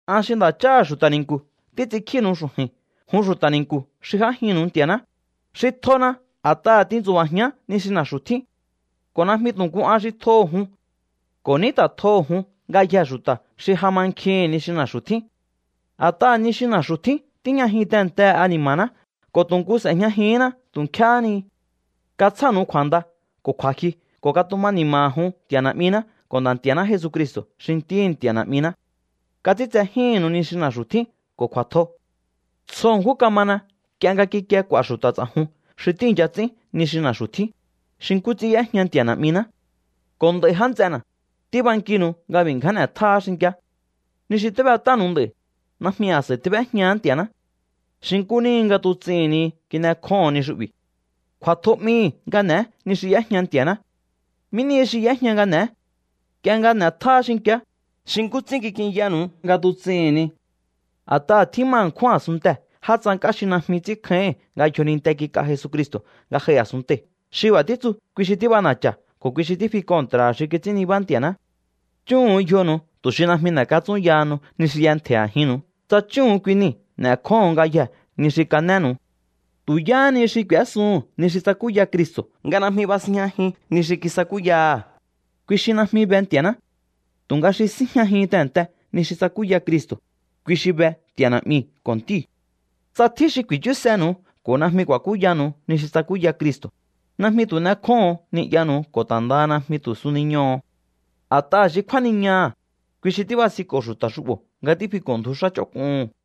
An xi nda̱cháha̱ xu̱ta̱ ni̱nku̱ títs'inkjínu̱u xu̱ju̱i̱n jun xu̱ta̱ ni̱nku̱ xi j'ájinnu̱u Nti̱a̱ná, xi tjona a̱t'aha̱ tintsu̱ba̱jián ni xi na̱xu̱ tjín. Ko̱ najmi tu̱ nku an xi tjoho̱ jun. Ko̱ ní ta̱ tjoho̱ jun ngayjee̱ xu̱ta̱ xi ja mankjihi̱n ni xi na̱xu̱ tjín. A̱t'aha̱ ni xi na̱xu̱ tjín tíjñajin tehe̱nte ani̱ma̱ná ko̱ tu̱ nku s'e̱jñajihínná tu̱ nkjéhé ni. Katsjánu̱u kju̱a̱nda ko̱ kju̱a̱jyu ko̱ katuma ni̱ma̱ha̱ jun Nti̱a̱ Na̱'miná ko̱ Nda̱ Nti̱a̱ná Jesucristo̱ xi Ntíhi̱ Nti̱a̱ Na̱'miná. Kats'ínts'ejíhi̱nnu̱u ni xi na̱xu̱ tjín ko̱ kju̱a̱tjo. Tsjo ṉkjún kamana nk'ie nga kikie k'u̱a̱ xu̱ta̱ ts'a̱jun xi tíi̱ncha ts'ín ni xi na̱xu̱ tjín, xi nkú ts'ín y'éjña Nti̱a̱ Na̱'miná. Ko̱ nd'a̱i̱ já nts'ena̱, tíbankinu̱u nga b'i̱ ngján n'e̱tjáá xinki̱á. Ni xi tíb'et'ánu̱u nd'a̱i̱, najmi a̱s'a̱i tíb'éjñahá Nti̱a̱ná. Xi nkú níhi nga tuts'ihi̱n ni kin'ekjóho̱on ni xu'bi̱. Kju̱a̱tjo 'mihi̱ nga n'e̱e ni xi y'éjña Nti̱a̱ná. ¿Mí nihi xi y'éjña nga n'e̱é? Nk'ie nga n'e̱tjáá xinki̱á, xi nkú ts'ín kik'inyanu̱u nga tuts'ihi̱n ni. A̱t'aha̱ tjíma ṉkjún a̱sunntee̱ já tsank'á xi najmi ts'ínkjáíhi̱n nga yjoninte kik'a Jesucristo̱ nga j'ai a̱sunntei̱. Xi b'a̱ títsu, kui xi tíb'ana̱cha̱ ko̱ kui xi fi kontra̱ha̱ xi kits'ín nibá Nti̱a̱ná. Chúhu̱un yjonu̱u tu̱ xi najmi n'e̱katsúnyahanu ni xi y'entje̱i̱ a̱jinnu̱u. Tsa chúhu̱un kui nii̱, n'e̱kjóho̱on ngayjee̱ ni xi kanénu̱u. Tu̱ yáhani xi k'u̱ésuhu̱n ni xi tsakúya Cristo̱ nga najmi basinjñajin ni xi kisakúya̱ha̱, kui xi najmi be Nti̱a̱ná. Tu̱nga xi síjñajin tehe̱nte ni xi tsakúya Cristo̱, kui xi be Nti̱a̱ Na̱'miu̱ ko̱ Ntíu̱. Tsa tjín xi ku̱i̱chúsenu̱u ko̱ najmi ku̱a̱kúyanu̱u ni xi tsakúya Cristo̱, najmi tu̱ n'ekjóho̱on ni'yanu̱u ko̱ ta̱ ndaha najmi tu̱ suniñoho̱o. A̱t'aha̱ xi kjúániñaha̱, kui xi tíbasinko̱ xu̱ta̱ xu'bo̱ nga tífiko̱ndju xá ch'onk'uhu̱n.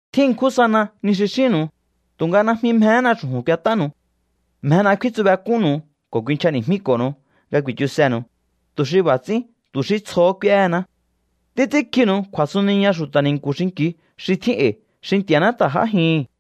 Tjín ṉkjún sana ni xi xínnu̱u, tu̱nga najmi mjehéna xu̱ju̱n k'uet'ánu̱u. Mjena kfíntsubek'únnu̱u ko̱ kuinchjani̱jmíko̱nu̱u nga ku̱i̱chusenu̱u, tu̱ xi b'a̱ ts'ín tu̱ xí tsjohó k'úéhená. Títs'ínkjinu̱u kju̱a̱suniña xu̱ta̱ ni̱nku̱ xinki̱u xi tjín e̱i̱ xi Nti̱a̱ná ta̱ j'ájihi̱n.